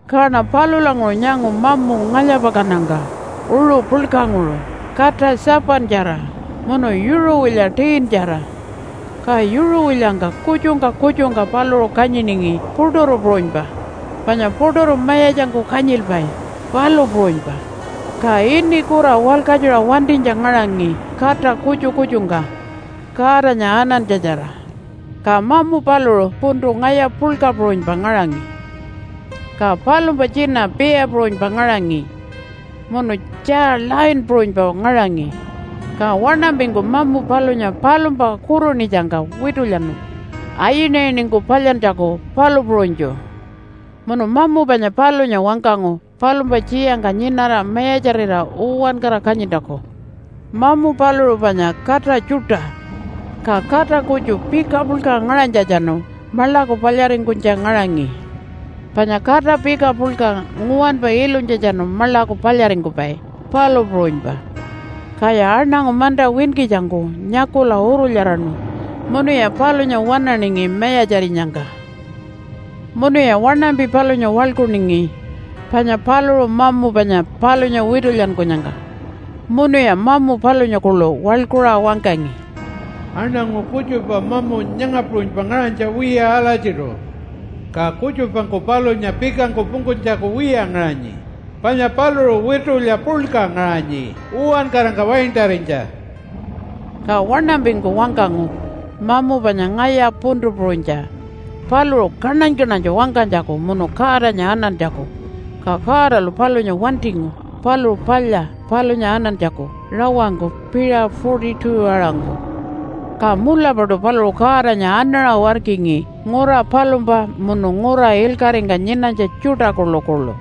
Kaṉa palulanguṟu nyangu mamu ngalya-pakannyangka uṟu puḻkanguṟu kata 7-tjara munu yuṟuwilya 10-tjara. Ka yuṟuwilyangka kutjungka kutjungka paluṟu kanyiningi puṯuru puṟunypa panya puṯuru mayatjangku kanyilpai, palu puṟunypa, ka ini kura walkatjuṟa wantinytja ngaṟangi kata kutju kutjungku Godanya anantja-tjara. Ka mamu paluṟu puntu ngaya puḻka puṟunypa ngaṟangi, ka palumpa tjina bear puṟunypa ngaṟangi munu tjaa lion puṟunypa ngaṟangi. Ka waṉampingku mamu palunya palumpa kurunitjangka witulyanu ayinayiningku palyantjaku palu puṟunytju. Munu mamu panya palunya wangkangu palumpa tjiyangka nyinara mayatjarira uwankara kanyintjaku. Mamu paluṟu panya kata tjuṯa, ka kata kutju pika puḻka ngaṟanytjatjanu maḻaku palyaringkunytja ngaṟangi, panya kata pika puḻka nguwanpa ilunytjatjanu maḻaku palyaringkupai palu puṟunypa. Kaya aṉangu manta winkitjangku nyakula urulyaraṉu munuya palunya waṉaningi mayatjarinyangka. Munuya waṉampi palunya waḻkuningi panya paluṟu mamu panya palunya witulyankunyangka. Munuya mamu palunya kuḻu waḻkuṟa wangkangi, “Aṉangu kutjupa mamu nyanga puṟunypa ngaṟanytja wiya alatjiṯu. Ka kutjupangku palunya pikangku pungkunytjaku wiya ngaṟanyi, panya paluṟu witulya puḻka ngaṟanyi uwankarangka waintarinytja.” Ka waṉampingku wangkangu mamu panya ngaya puntu puṟunytja paluṟu kaṉany-kaṉanytju wangkanytjaku munu Godanya anantjaku, ka Godalu palunya wantingu paluṟu palya palunya anantjaku rawangku piṟa 42-aṟangku. Ka mulapaṯu paluṟu Godanya anaṟa warkingi, ngura palumpa munu ngura ilkaṟingka nyinanytja tjuṯa kuḻukuḻu.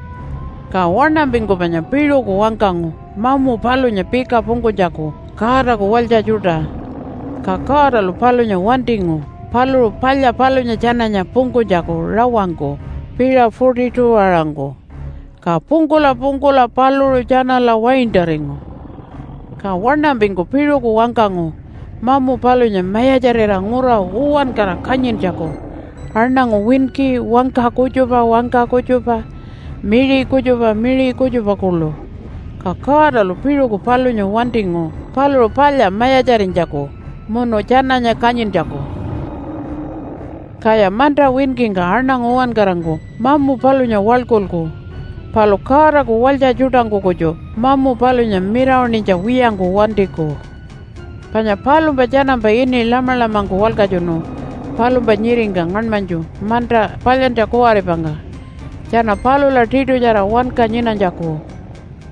Ka waṉampingku panya piṟuku wangkangu mamu palunya pika pungkunytjaku Godaku walytja tjuṯa, ka Godalu palunya wantingu paluṟu palya palunya tjananya pungkunytjaku rawangku piṟa 42-aṟangku ka pungkula pungkula paluṟu tjanala waintaringu. Ka waṉampingku piṟuku wangkangu mamu palunya mayatjarira ngura uwankara kanyintjaku aṉangu winki wangka kutjupa wangka kutjupa miṟi kutjupa miṟi kutjupa kuḻu. Ka Godalu piṟuku palunya wantingu paluṟu palya mayatjarinytjaku munu tjananya kanyintjaku. Kaya manta winkingka aṉangu uwankarangku mamu palunya waḻkulku, palu Godaku walytja tjuṯangku kutju mamu palunya mirawaṉinytja wiyangku wantiku. Panya palumpa tjanampa ini Lamalamangku walkatjunu palumpa nyiringka ngaṉmanytju manta palyantja kuwaripangka tjana palula tiṯutjara wanka nyinanytjaku.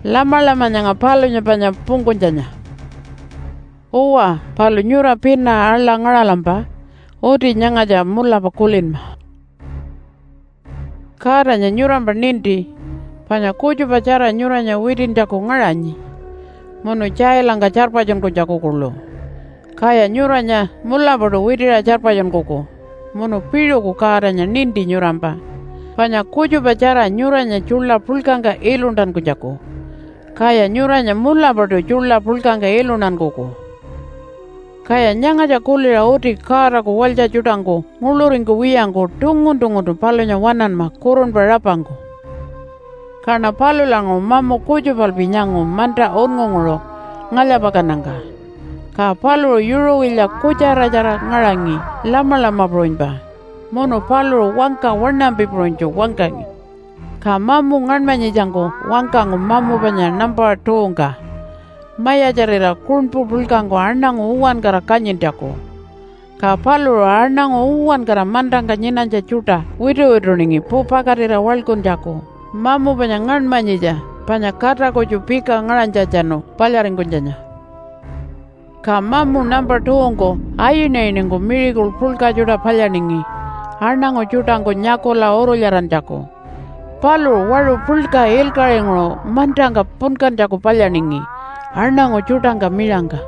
Lamalama nyanga palunya panya pungkunytjanya. Uwa, palu nyura pina aḻa ngaṟalampa uti nyangatja mulapa kulinma, “Godanya nyurampa ninti panya kutjupatjara nyuranya witintjaku ngaṟanyi munu tjailangka tjarpatjunkunytjaku kuḻu, kaya nyuranya mulapaṯu witiṟa tjarpatjunkuku. Munu piṟuku Godanya ninti nyurampa panya kutjupatjara nyuranya tjuḻa puḻkangka iluntankunytjaku, kaya nyuranya mulapaṯu tjuḻa puḻkangka iluntankuku.” Kaya nyangatja kuliṟa uti Godaku walytja tjuṯangku nguḻuringkuwiyangku tungun-tunguntu palunya waṉanma kurunpa rapangku. Kaṉa palulanguṟu mamu kutjupalpi nyangu manta unngunguṟu ngalya-pakannyangka. Ka paluṟu yuṟuwilya kutjara-tjara ngaṟangi lamalama puṟunypa munu paluṟu wangka waṉampi puṟunytju wangkangi. Ka mamu ngaṉmanyitjangku wangkangu mamu panya nampa 2-ngka mayatjarira kuṉpu puḻkangku aṉangu uwankara kanyintjaku. Ka paluṟu aṉangu uwankara mantangka nyinanytja tjuṯa wituwituningi pupakatira waḻkuntjaku mamu panya ngaṉmanyitja panya kata kutju pika ngaṟanytjatjanu palyaringkunytjanya. Ka mamu nampa 2-ngku ayinayiningku miracle puḻka tjuṯa palyaningi aṉangu tjuṯangku nyakula urulyarantjaku. Paluṟu waṟu puḻka ilkaṟinguṟu mantangka punkantjaku palyaningi aṉangu tjuṯangka miṟangka.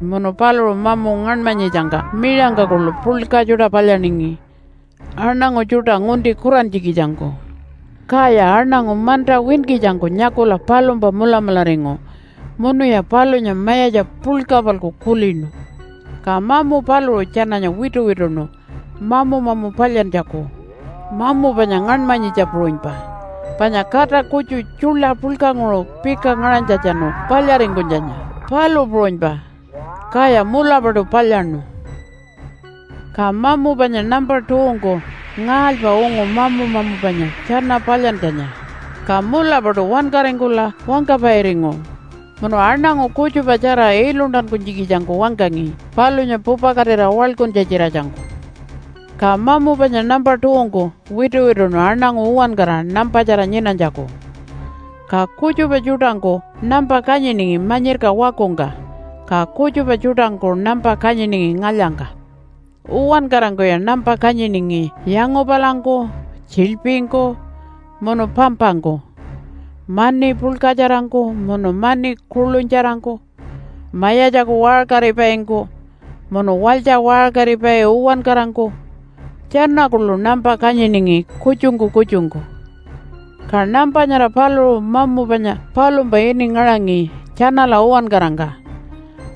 Munu paluṟu mamu ngaṉmanyitjangka miṟangka kuḻu puḻka tjuṯa palyaningi aṉangu tjuṯa ngunti kurantjikitjangku, kaya aṉangu manta winkitjangku nyakula palumpa mulamularingu, munuya palunya mayatja puḻka-palku kulinu. Ka mamu paluṟu tjananya wituwituṉu mamu-mamu palyantjaku mamu panya ngaṉmanyitja puṟunypa, panya kata kutju tjuḻa puḻkanguṟu pika ngaṟanytjatjanu palyaringkunytjanya, palu puṟunypa. Kaya mulapaṯu palyaṉu. Ka mamu panya nampa 2-ngku ngaalypa ungu mamu-mamu panya tjana palyantjanya, ka mulapaṯu wankaringkula wangkapairingu munu aṉangu kutjupatjara iluntankunytjikitjangku wangkangi palunya pupakatira waḻkuntja-tjiratjangku. Ka mamu panya nampa 2-ngku wituwituṉu aṉangu uwankara nampatjara nyinanytjaku. Ka kutjupa tjuṯangku nampa kanyiningi manyirka wakungka, ka kutjupa tjuṯangku nampa kanyiningi ngalyangka. Uwankarangkuya nampa kanyiningi yangupalangku, tjiḻpingku, munu pampangku, mani puḻkatjarangku munu mani kuḻunytjarangku, mayatjaku waṟkaripaingku munu walytja waṟkaripai uwankarangku tjana kuḻu nampa kanyiningi kutjungku kutjungku. Ka nampa nyara paluṟu mamu panya palumpa ini ngaṟangi tjanala uwankarangka.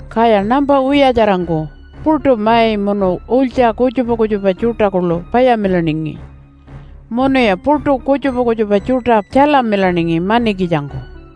Kaya nampa wiyatjarangku puṯu mai munu ulytja kutjupa kutjupa tjuṯa kuḻu payamilaningi, munuya puṯu kutjupa kutjupa tjuṯa tjalamilaningi manikitjangku.